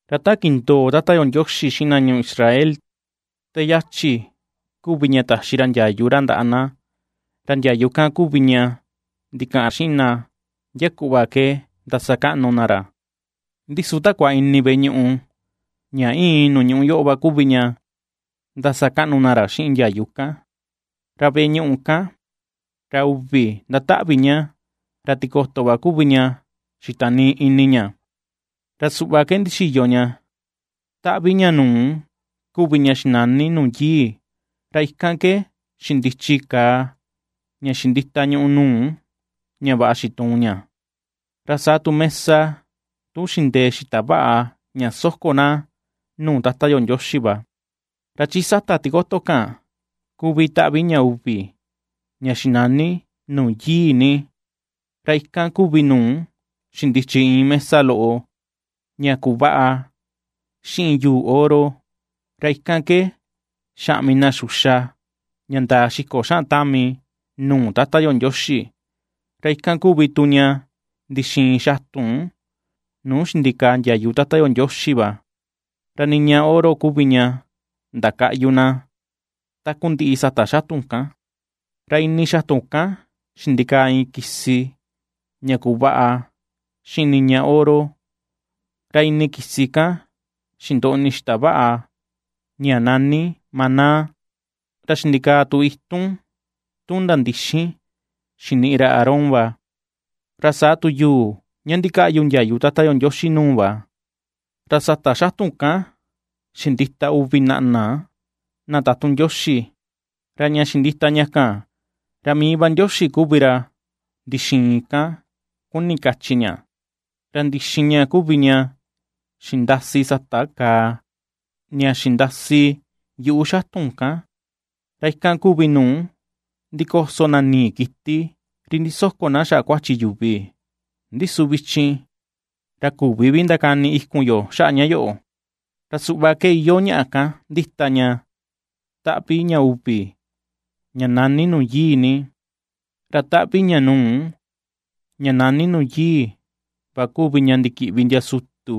Ra ta kindoo Tata yo Ndioxi xiꞌin na ñuu Israel te yachi kuvi ña taxi ra ndiayu ra ndaꞌa na, ra ndiayu kan kuvi ña ndikaꞌan xiꞌin na ndia kuꞌva ke ndasakaꞌnu na ra. Ndi su takua ini veꞌe ñuꞌu ña íin nuu ñuꞌú yoꞌo va kuvi ña ^ndasakaꞌnu na ra xiꞌin ndiayu kan. Ra veꞌe ñuꞌu kan, ra uvi ndataꞌvi ña; ra tikoto va kuvi ña xitanii ini ña, ra suꞌva ke ndixiyo ña: taꞌvi ña nuu kuvi ña xinani Nuu Yii, ra ikan ke xindichi kàà ña xindita ñùꞌù nuu ña vaꞌa xituun ña, ra saa tu mesa tun xindee xita vaꞌa ña soko na nuu Tata yo Ndioxi va. Ra chi sata tikoto kan kuvi taꞌvi ña uvi, ña xinani Nuu Yii Ni. Ra ikan kuvi nuu xindichi iin mesa loꞌo ña kuvaꞌa xiꞌin yuu oro, ra ikan ke xaꞌmi na xuxa ña ndaa xiko xaꞌan tami nuu Tata yo Ndioxi, ra ikan kuvi tu ña ndixiin xatun nuu xindikaa ndiayu Tata yo Ndioxi va, ra niña oro kuvi ña ndakaꞌyu na takundiꞌi sata xatun kan. Ra ini xatun kan xindikaa iin kisi ña kuvaꞌa xiꞌin niña oro, ra ini kisi kan xindoꞌni xita vaꞌa ña nani maná, ra xindikaa tu itun tun ndandixin xiniꞌi ra Aarón va, ra saa tu yuu ña ndikaꞌyu ndiayu Tata yo Ndioxi nuu va. Ra sata xatun kan xindita uvi naꞌna na tatun Ndioxi; ra ña xindita ña kan, ra mii va Ndioxi kuvi ra ndixiin kan, kuni kachi ña; ra ndixin ña kuvi ña xindasi sata kàà ña xindasi yuꞌu xatun kan, ra ikan kuvi nuu ndikoso na nii kiti ri ndisoko na xaꞌa kuachi yuvi. Ndi su vichin, ra küvi vi ndakani ikun yo xaꞌa ña yoꞌo. Ra suꞌva ke iyoo ñaꞌa kan ndita ña taꞌvi ña uvi ña nani Nuu Yii Ni; ra taꞌvi ña nuu, ña nani Nuu Yii va kuvi ña ndikiꞌvi ndia sutu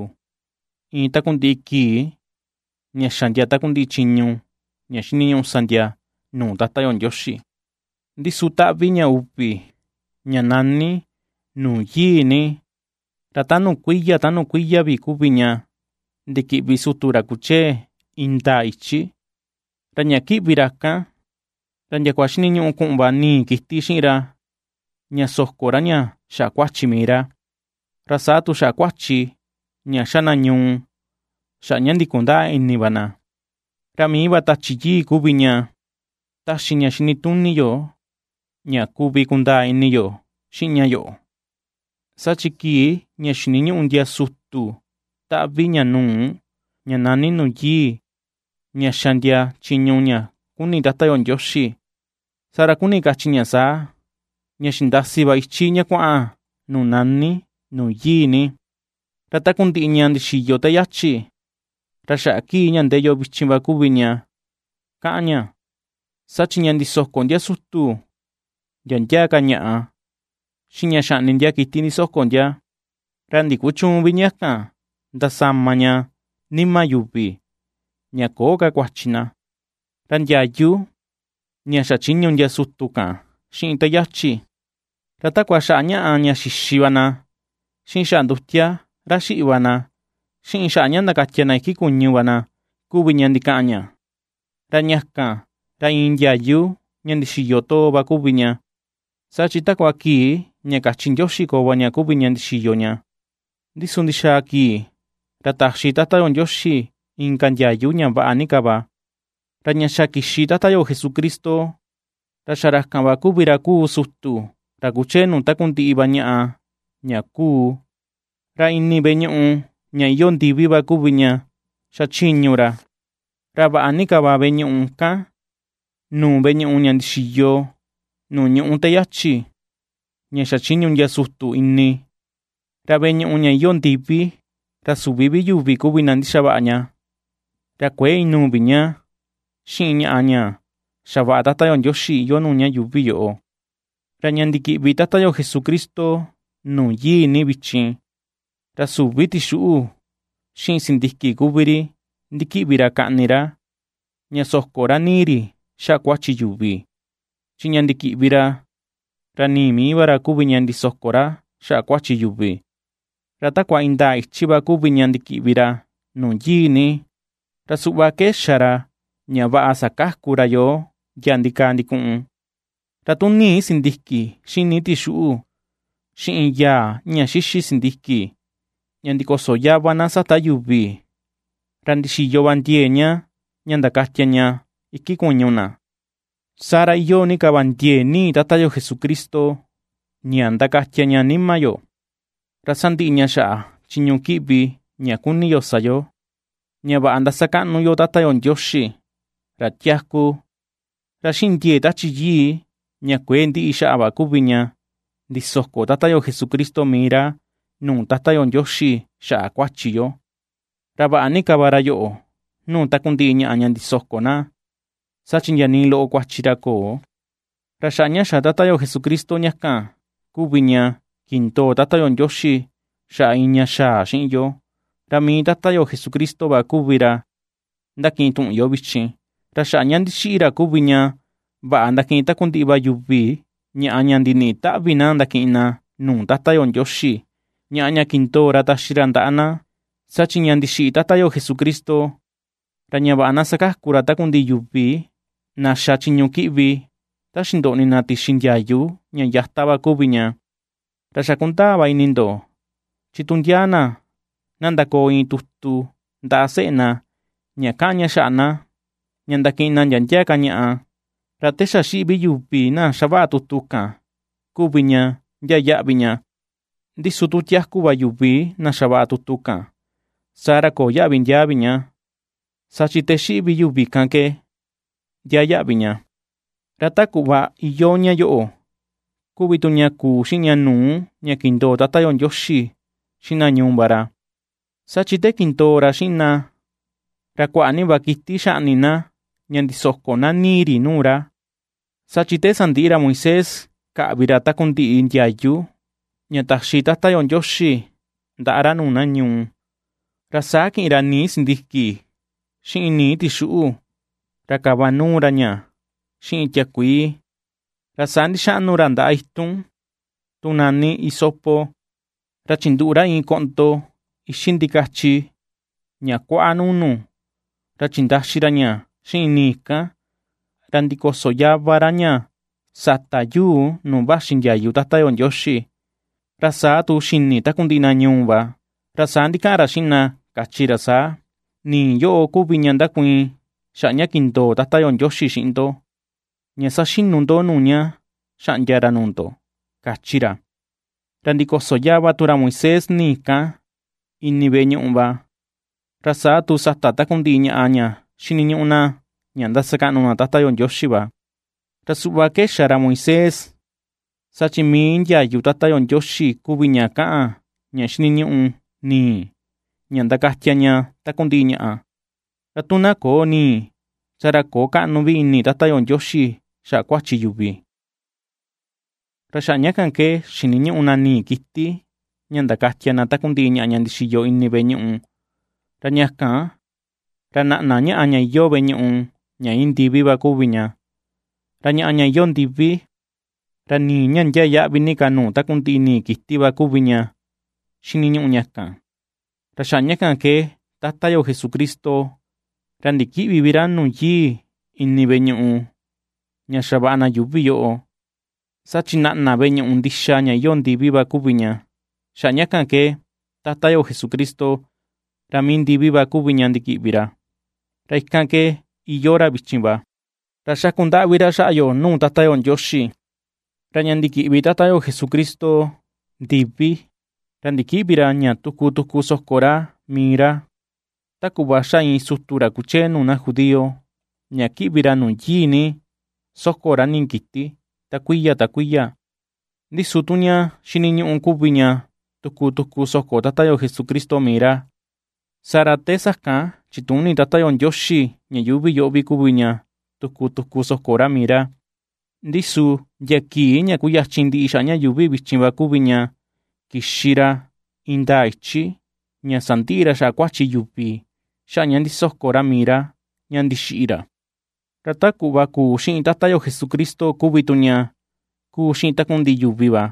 iin takundiꞌi kii ña xa ndia takundiꞌi chiñu ña xiniñuꞌu sa ndia nuu Tata yo Ndioxi. Ndi su taꞌvi ña uvi ña nani, Nuu Yii Ni, ra ta nuu kuiya ta nuu kuiya vi kuvi ña ndikiꞌvi sutu ra kuchee indaa ichi; ra ña kiꞌvi ra kan, ra ndiakua xiniñuꞌu kuꞌun va nii kiti xiꞌin ra ña soko ra ña xaꞌa kuachi mii ra, ra saa tu xaꞌa kuachi ña xa na ñuu xaꞌa ña ndikundäa ini va na. Ra mii va Tachi Yii kuvi ña ^taxi ña xinituni yo ña kuvi kundaa ini yo xiꞌin ña yoꞌo: saa chi kii ña xiniñuꞌu ndia sutu taꞌvi ña nuu, ña nani, Nuu Yii ña ^xa ndia chiñu ña kuni Tata yo Ndioxi, saa ra kuni kachi ña saa, ña xindasi va ichi ña kuaꞌan nuu nani, Nuu Yii Ni. Ra takundiꞌi ña ndixiyo te yachi, ra xaꞌa kii ña ndee yo vichin va kuvi ña kaꞌan ña. Saa chi ña ndisoko ndia sutu ndia ndia ka ñaꞌa, xiꞌin ña xaꞌni ndia kiti ndisoko ndia, ra ndikuchüun vi ña kan, ndasama ña, nima yuvi, ña köo ka kuachi na. Ra ndiayu ña xachiñu ndia sutu kan xiꞌin te yachi, ra takua xaꞌa ñaꞌa ña xixi va na, xiꞌin xaꞌa ndutia ra xiꞌi va na, xiꞌin xaꞌa ña ndakatia na iki kuñu va na kuvi ña ndikaꞌan ña. Ra ña kan, ra iin ndiayu ña ndixiyo too va kuvi ña, saa chi takua kii ña kachi Ndioxi koo va ña kuvi ña ndixiyo ña, ndi su ndixaa kii ra taxi Tata yo Ndioxi inka ndiayu ña vaꞌa ni ka va. Ra ña xa kixi Tata yo Jesucristo, ra xa ra kan va kuvi ra kuu sutu ra kuchee nuu takundiꞌi ña vaꞌa ña ^kuu. Ra ini veꞌe ñuꞌu ña iyoo ndivi va kuvi ña xachiñu ra, ra vaꞌa ni ka va veꞌe ñuꞌu kan nuu veꞌe ñuꞌu ña ndixiyo nuu ñuꞌú te yachi, ña xachiñu ndia sutu ini; ra veꞌe ñuꞌu ña iyoo ndivi, ra süvi vi yuvi kuvi na ndixavaꞌa ña, ra kuëe inuu vi ña xiꞌin ñaꞌa ña xavaꞌa Tata yo Ndioxi iyoo nuu ña yuuvi yoꞌo. Ra ña ndikiꞌvi Tata yo Jesucristo Nuu Yii Ni vichin, ra süvi tixuꞌu, xiꞌin sindiki kuvi ri ndikiꞌvi ra kaꞌni ra ña soko ra nii ri xaꞌa kuachi yuvi, chi ña ndikiꞌvi ra, ra nii mii va ra kuvi ña ndisoko ra xaꞌa kuachi yuvi; ra takua indaa ichi va kuvi ña ndikiꞌvi ra Nuu Yii Ni; ra suꞌva ke xa ra ña vaꞌa sakaku ra yoo ndia ndikaa ndikuꞌun. Ra tu nii sindiki xiꞌin nii tixuꞌu, xiꞌin yaa ña ndixixi sindiki ña ndikoso yava na sata yuvi, ra ndixiyo va ndiee ña, ña ndakatia ña iki kuñu na, saa ra iyoo ni ka va ndiee nii Tata yo Jesucristo ña ndakatia ña nima yo, ra sandiꞌi ña xaꞌa chiñu kiꞌvi ña kuni yo sa yo, ña vaꞌa ndasakaꞌnu yo Tata yo Ndioxi, ra tiaku. Ra xiꞌin ndiee Tachi Yii ña kuëe ndiꞌi xaꞌa va kuvi ña ndisoko Tata yo Jesucristo mii ra nuu Tata yo Ndioxi xaꞌa kuachi yo. Ra vaꞌa ni ka va ra yoꞌo nuu takundiꞌi ñaꞌa ña ndisoko na, saa chi ndia nii loꞌo kuachi ra köo. Ra xaꞌa ña xa Tata yo Jesucristo ña kan kuvi ña kindoo Tata yo Ndioxi xaꞌa iin ña xaa xiꞌin yo, ra mii Tata yo Jesucristo va kuvi ra ^ndakiꞌin tuꞌun yo vichin. Ra xaꞌa ña ndixiꞌi ra kuvi tu ña vaꞌa ndakiꞌin takundiꞌi va yuvi ñaꞌa ña ndiniꞌi taꞌvi na ndakiꞌin na nuu Tata yo Ndioxi, ñaꞌa ña kindoo ra taxi ra ndaꞌa na. Saa chi ña ndixiꞌi Tata yo Jesucristo, ra ña vaꞌa na sakaku ra takundiꞌi yuvi na xa chiñu kiꞌvi ta xindoꞌni na tixi ndiayu ña yata va kuvi ña. Ra xa kundaa va ini ndo, chi tu ndia na, na ndakoo iin tutu ndaꞌa seꞌe na ña ^kaꞌan ña xaꞌa na, ña ndakiꞌin na ndia ndia ka ñaꞌa, ra te xa xiꞌi vi yuvi na ^xavaꞌa tutu kan kuvi ña ndiaa yaꞌvi ña. Ndi su tu tiaku va yuvi na xavaꞌa tutu kan, saa ra köo yaꞌvi ndiaa vi ña, saa chi te xa xiꞌi vi yuvi kan ke ndiaa yaꞌvi ña. Ra ta kuꞌva iyoo ña yoꞌo kuvi tu ña kuu xiꞌin ña nuu ña kindoo Tata yo Ndioxi xiꞌin na ñuu va ra, saa chi te kindoo ra xiꞌin na ra kuaꞌa ni va kiti xaꞌni na ña ndisoko na nii ri nuu ra. Saa chi te sandiꞌi ra Moisés kaꞌvi ra takundiꞌi ndiayu ña taxi Tata yo Ndioxi ndaꞌa ra nuu na ñuu, ra saa kiꞌin ra nii sindiki, xiꞌin nii tixuꞌu, ra kava nuu ra ña xiꞌin tiakuii, ra saa ndixaꞌnu ra ndaꞌa itun tun nani hisopo, ra chinduꞌu iin ra koꞌndo ixi ndikachi ña kuaꞌa nuu nu, ra chindaxi ra ña xiꞌin nii kan, ra ndikoso yava ra ña sata yuu nuu vaxi ndiayu Tata yo Ndioxi, ra saa tu xini takundiꞌi na ñuu va. Ra saa ndikaꞌan ra xiꞌin na kachi ra saa: “Nii yoꞌo, kuvi ña ndakuiin xaꞌa ña kindoo Tata yo Ndioxi xiꞌin ndo, ña saxinu ndo nuu ña xaꞌndia ra nuu ndo”, kachi ra. Ra ndikoso yava tu ra Moisés nii kan, ini veꞌe ñuꞌu va, ra saa tu sata takundiꞌi ñaꞌa ña xiniñuꞌu na ña ndasakaꞌnu na Tata yo Ndioxi va. Ra suꞌva ke xa Moisés, saa chi mii ndiayu Tata yo Ndioxi kuvi ña kaꞌan ña xiniñuꞌu nii, ña ndakatia ña takundiꞌi ñaꞌa; ra tu na köo nii, saa ra köo kaꞌnu vi ini Tata yo Ndioxi xaꞌa kuachi yuvi. Ra xaꞌa ña kan ke xiniñuꞌu na nii kiti ña ndakatia na takundiꞌi ñaꞌa ña ndixiyo ini veꞌe ñuꞌu; ra ña kan, ra naꞌna ñaꞌa ña iyoo veꞌe ñuꞌu ña íin ndivi va kuvi ña; ra ñaꞌa ña iyoo ndivi, ra nii ña ndiaa yaꞌvi ni ka nuu takundiꞌi nii kiti va kuvi ña xiniñuꞌu ña kan. Ra xaꞌa ña kan ke Tata yo Jesucristo, ra ndikïꞌvi vi ra nuu Yii ini veꞌe ñuꞌu ña xavaꞌa na yuuvi yoꞌo, saa chi naꞌna veꞌe ñuꞌu ndixa ña iyoo ndivi va kuvi ña; xaꞌa ña kan ke Tata yo Jesucristo, ra mii ndivi va kuvi ña ndikiꞌvi ra, ra ikan ke iyoo ra vichin va, ra xaku ndaꞌvi ra xaꞌa yo nuu Tata yo Ndioxi. Ra ña ndikiꞌvi Tata yo Jesucristo ndivi, ra ndikïꞌvi ra ña tuku tuku soko ra mii ra, ta kuꞌva ^xa iin sutu ra kuchee nuu na judío ña ^kiꞌvi ra Nuu Yii Ni soko ra nii kiti, ta kuiya ta kuiya. Ndi su tu ña ndixiniñuꞌu kuvi ña tuku tuku soko Tata yo Jesucristo mii ra, saa ra te sakan chituni Tata yo Ndioxi ña yuuvi yoꞌo vi kuvi ña tuku tuku soko ra mii ra; ndi su ndia kii ña kuyachin ndiꞌi xaꞌa ña yuuvi vichin va kuvi ña kixi ra indaa ichi, ña sandiꞌi ra xaꞌa kuachi yuvi xaꞌa ña ndisoko ra mii ra ña ndixiꞌi ra. Ra ta kuꞌva kuu xiꞌin Tata yo Jesucristo kuvi tu ña ^kuu xiꞌin takundiꞌi yuvi va,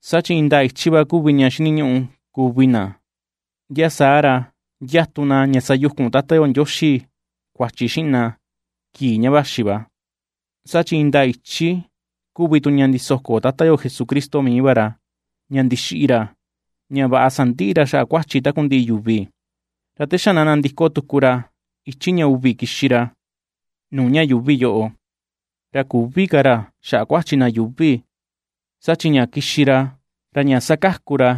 saa chi indaa ichi va kuvi ña xiniñuꞌu kuvi na, ndia saa ra ndiatu na ña sayukun Tata yo Ndioxi kuachi xiꞌin na kii ña vaxi va. Saa chi indaa ichi kuvi tu ña ndisoko Tata yo Jesucristo mii va ra, ña ndixiꞌi ra, ña vaꞌa sandiꞌi ra xaꞌa kuachi takundiꞌi yuvi. Ra te xa na nandiko tuku ra ichi ña uvi kixi ra nuu ña yuuvi yoꞌo, ra küvi ka ra xaꞌa kuachi na yuuvi, saa chi ña kixi ra, ra ña sakaku ra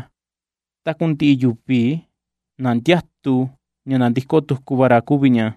takundiꞌi yuvi na ndiatu ña nandiko tuku va ra kuvi ña.